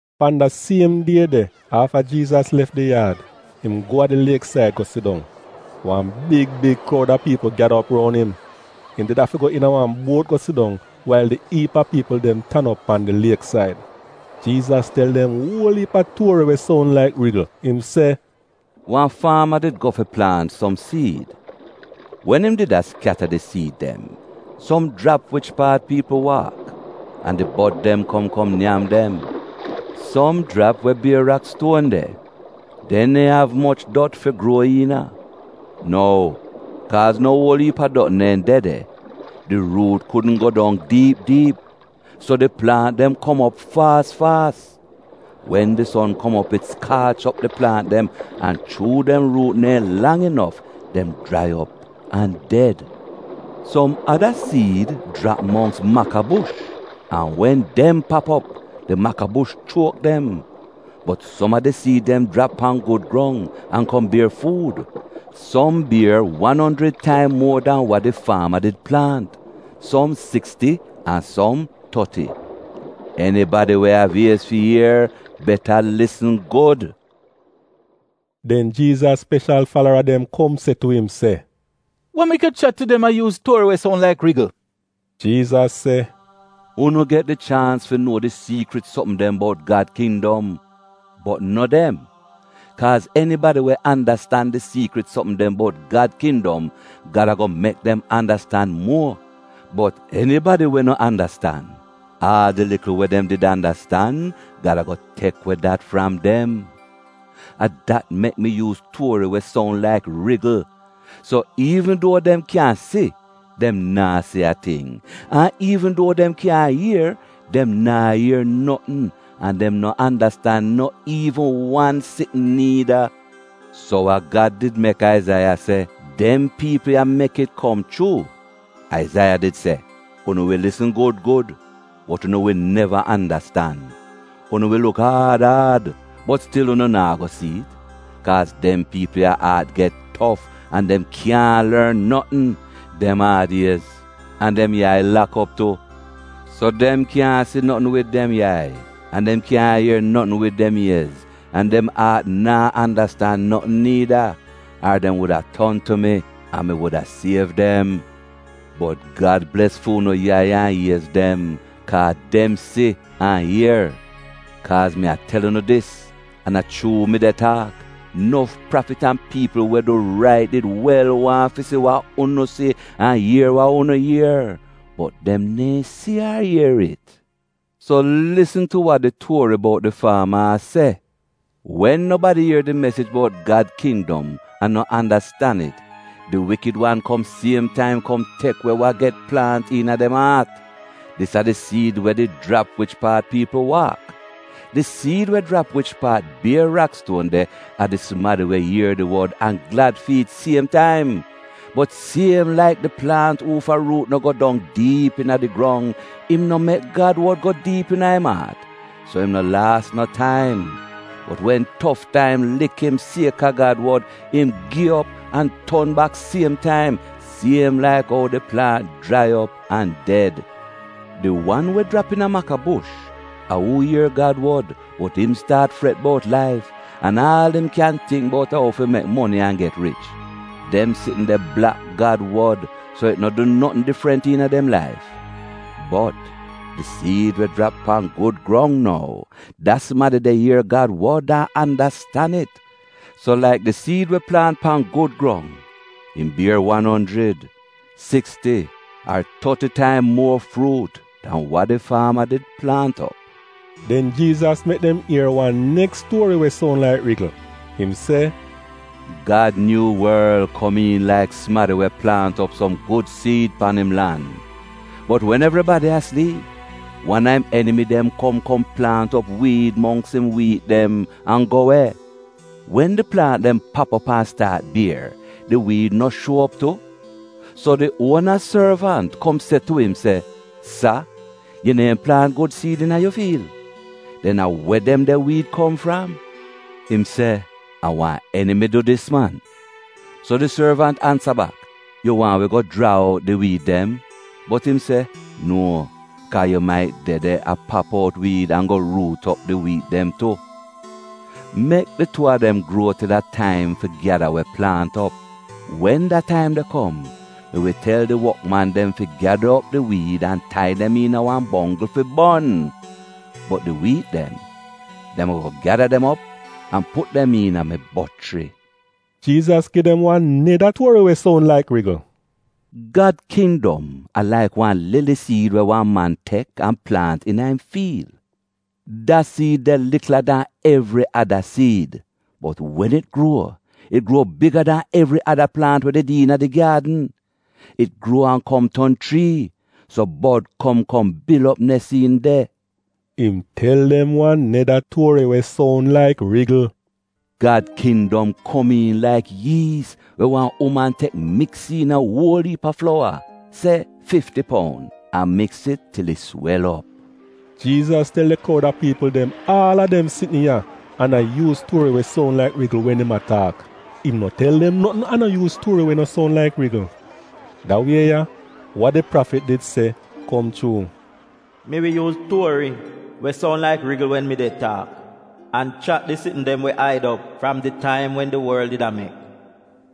Pan da siem die de afta Jiizas lef di yaad, im go a di lieksaid go sidong. Wan big big kroud a piipl gyada op roun im. Im did afi go iina wan buot go sidong wail di iip a piipl dem tan op pan di lieksaid. Jiizas tel dem uol iip a tuori we soun laik rigl. Im se, “Wan faama did go fi plaant som siid. Wen im did a skyata di siid dem, som jrap wich paat piipl waak, an di bod dem kom kom nyam dem. Som jrap we bier rakstuon de. Dem neehn av moch dot fi gruo iina. Nou, kaaz no uol iip a dot neehn de de, di ruut kudn go dong diip diip so di plaant dem kom op faas faas. Wen di son kom op it skaach op di plaant dem, an, chuu dem ruut neehn lang inof, dem jrai op an ded. Som ada siid jrap mongks makabush, an wen dem pap op, di makabush chuok dem. Bot som a di siid dem jrap pan gud grong, an kom bier fuud. Som bier wan onjrid taim muo dan wa di faama did plaant, som siksti an som toti.” Enibadi we av iez fi ier — beta lisn gud!” Den Jiizas speshal falara dem kom se tu im se, “Wa mek yu chat tu dem a yuuz tuori we soun laik rigl?” Jiizas se, “Unu get di chaans fi nuo di siikrit sopm dem bout Gad kindom, bot no dem. Kaaz enibadi we andastan di siikrit sopm dem bout Gad kindom, Gad ago mek dem andastan muo, bot enibadi we no andastan, aal di likl we dem did andastan, Gad ago tek we dat fram dem. A dat mek mi yuuz tuori we soun laik rigl: “So iivn duo dem kyan si, dem naa si a ting, an iivn duo dem kyan ier, dem naa ier notn, an dem no andastan no iivn wan sitn niida. So wa Gad did mek Aizaiya se, dem piipl ya mek it kom chuu. Aizaiya did se: “‘Unu wi lisn gud gud, bot unu wi neva andastan, Unu wi luk aad aad, bot stil unu naa go si'it. Kaaz dem piipl ya aat get tof, an dem kyaahn lorn notn. Dem aad-iez, an dem yai lak op tu. So dem kyaahn si notn wid dem yai an dem kyaahn ier notn wid dem iez, an dem aat naa andastan notn niida, ar dem wuda ton tu mi, an mi wuda siev dem.’ Bot Gad bles fu'unu yai an iez dem, kaa dem si an ier! Kaaz mi a tel unu dis, an a chuu mi de taak, nof prafit an piipl we du rait did wel waahn fi si wa unu si, an ier wa unu ier bot dem neehn si ar ier it. “So lisn tu wa di tuori bout di faama a se: Wen nobadi ier di mesij bout Gad kindom an no andastan it, di wikid wan kom siem taim kom tek we wa get plaant iina dem aat. Dis a di siid we did jrap wich paat piipl waak. Di siid we jrap wich paat bier rakstuon de a di sumadi we ier di wod an glad fi it siem taim. Bot siem laik di plaant uufa ruut no go dong diip iina di grong, im no mek Gad wod go diip iina im aat, so im no laas no taim. Bot wen tof taim lik im sieka Gad wod, im gi op an ton bak siem taim — siem laik ou di plaant jrai op an ded. Di wan we jrap iina makabush, a uu ier Gad wod bot im staat fret bout laif, an aal im kyan tingk bout a ou fi mek moni an get rich. Dem sitn de blak Gad wod, so it no du notn difrant iina dem laif. Bot di siid we jrap pan gud grong nou, da sumadi de ier Gad wod an andastan it. So, laik di siid we plaant pan gud grong im bier wan onjrid, siksti ar toti taim muo fruut dan wa di faama did plaant op.” Den Jiizas mek dem ier wan neks tuori we soun laik rigl. Im se, “Gad nyuu worl, komiin laik sumadi we plaant op som gud siid pan im lan. Bot wen evribadi a sliip, wan a im enimi dem kom kom plaant op wiid mongks im wiit dem, an go we. Wen di plaant dem pap op an staat bier, di wiid no shuo op tu. “So di uona sorvant kom se tu im se, ‘Sa, yu neehn plaant gud siid iina yu fiil? Den a we dem de wiid kom fram?” “Im se, ‘A wan enimi du dis man.’ “So di sorvant ansa bak, ‘Yu waahn wi go jraa out di wiid dem?’ “Bot im se, ‘Nuo, kaa yu mait de de a pap out wiid an go ruut op di wiit dem tu.’ Mek di tuu a dem gruo til a taim fi gyada we plaant op. Wen da taim de kom mi wi tel di wokman dem fi gyada op di wiid an tai dem iina wan bonggl fi bon. Bot di wiit dem, dem ago gyada dem op an put dem iina mi bochri.’” Jiizas gi dem wan neda tuori we soun laik rigl: “Gad kindom a laik wan lili siid we wan man tek an plaant iina im fiil. Da siid de likla dan evri ada siid, bot wen it gruo, it gruo biga dan evri ada plaant we did iina di gyaadn. It gruo an kom ton chrii, so bod kom kom bil op nes iin de.” Im tel dem wan neda tuori we soun laik rigl: “Gad kindom komiin laik yiis we wan uman tek miks iina uol iip a flowa — se fifti poun — an miks it til it swel op.” Jiizas tel di kroud a piipl dem aal a dem sitn ya, an a yuuz tuori we soun laik rigl wen im a taak. Im no tel dem notn an no yuuz tuori we no soun laik rigl. Da wie ya, wa di prafit did se, kom chuu: “Mi wi yuuz tuori we soun laik rigl wen mi de taak, an chat di sitn dem we aid op fram di taim wen di worl did a mek.”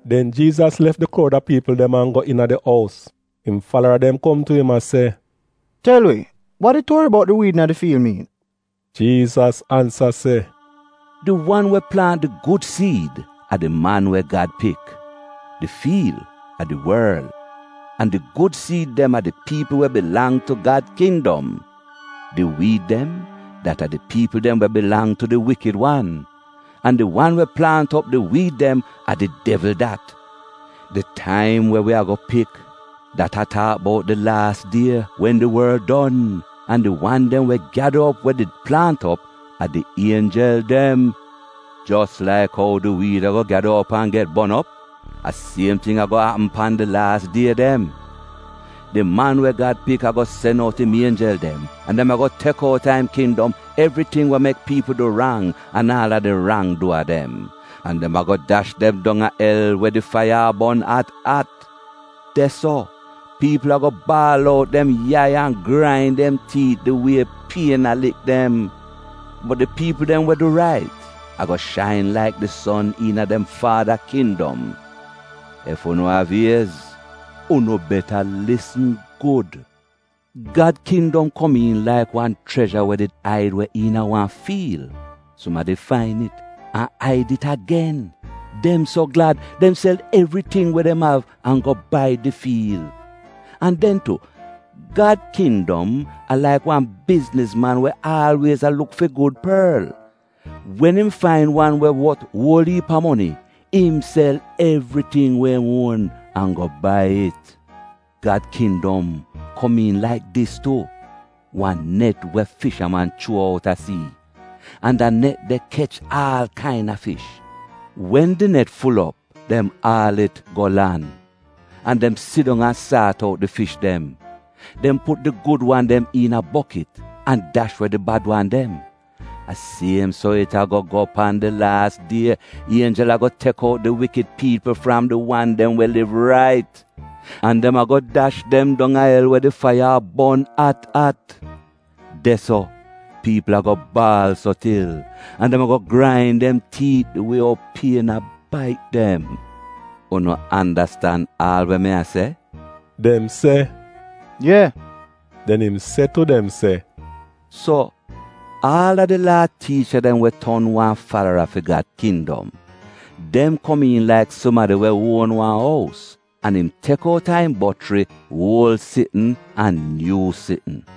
Den Jiizas lef di kroud a piipl dem an go iina di ous. Im falara dem kom tu im a se, “Tel wi wa di tuori bout di wiid iina di fiil miin?” Jiizas ansa se, “Di wan we plaant di gud siid a di Man we Gad Pik. Di fiil — a di worl, an di gud siid dem a di piipl we bilang tu Gad kindom. Di wiid dem, dat a di piipl dem we bilang tu di Wikid wan, an di wan we plaant op di wiid dem, a di devl dat. Di taim we wi go pik, dat a taak bout di laas die, wen di worl don. An di wan dem we gyada op we did plaant op a di ienjel dem. “Jos laik ou di wiid ago gyada op an get bon op, a siem ting ago apm pan di laas die dem. Di Man we Gad Pik ago sen out im ienjel dem, an dem ago tek out a im kindom evriting we mek piipl du rang an aal a di rang-duwa dem. An dem ago dash dem dong a el we di faiya a bon at at. De-so, piipl ago a baal out dem yai an a grain dem tiit di wie pien a lik dem. Bot di piipl dem we du rait, ago shain laik di son iina dem Faada kindom. Ef unu av iez, unu beta lisn gud! “Gad kindom komiin laik wan chrezha we did aid we iina wan fiil. Sumadi fain it an aid it agen. Dem so glad, dem sel evriting we dem av an go bai di fiil. “An den tu, Gad kindom a laik wan biznizman we aalwiez a luk fi gud porl. Wen im fain wan we wot uol iip a moni, im sel evriting we im uon an go bai it. “Gad kindom komiin laik dis tu — wan net we fishaman chuo out a sii. An da net de kech aal kaina fish. Wen di net ful op, dem aal it go lan. An dem sidong an saat out di fish dem. Dem put di gud wan dem iina bokit, an dash we di bad wan dem. A siem so it ago go pan di laas die. Ienjel ago tek out di wikid piipl dem fram di wan dem we liv rait. An dem ago dash dem dong a el we di faiya a bon at at. De-so, piipl ago a baal so til, an dem ago grain dem tiit di wie ou pien a bait dem. “Unu andastan aal we mi a se?” Dem se, “Ye.” Den im se tu dem se, “So, aal a di Laa tiicha dem we ton wan falara fi Gad kindom, dem komiin laik sumadi we uon wan ous an im tek out a im bochri uol sitn an nyuu sitn.”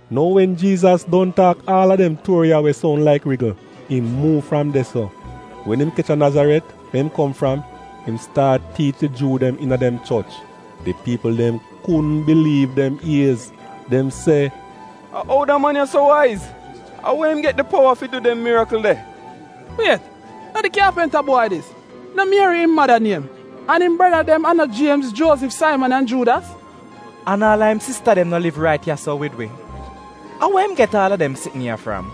Nou wen Jiizas don taak aal a dem tuori ya we soun laik rigl, im muuv fram de-so. Wen im kech a Nazaret, we im kom fram, im staat tiich di Juu dem iina dem choch. Di piipl dem kudn biliiv dem iez. Dem se, “A ou da man ya so waiz? A we im get di powa fi du dem mirikl de? “Wiet! No di kyaapinta bwai dis? No Mieri im mada niem? An im breda dem a no Jiemz, Juozif, Saiman an Juudas? An aal a im sista dem no liv rait ya-so wid wi? A we im get aal a dem sitn ya fram?”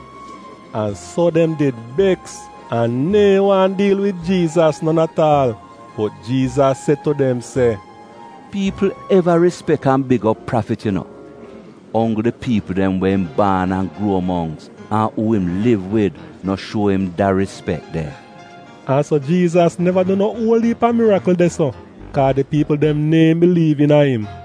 An so dem did beks an neehn waahn diil wid Jiizas non at aal. Bot Jiizas se tu dem se, “Piipl eva rispek an big op prafit yu no, onggl di piipl dem we im baan an gruo mongks an uu im liv wid no shuo im da rispek de.” An so Jiizas neva du no uol iip a mirikl de-so kaa di piipl dem neehn biliiv iina im.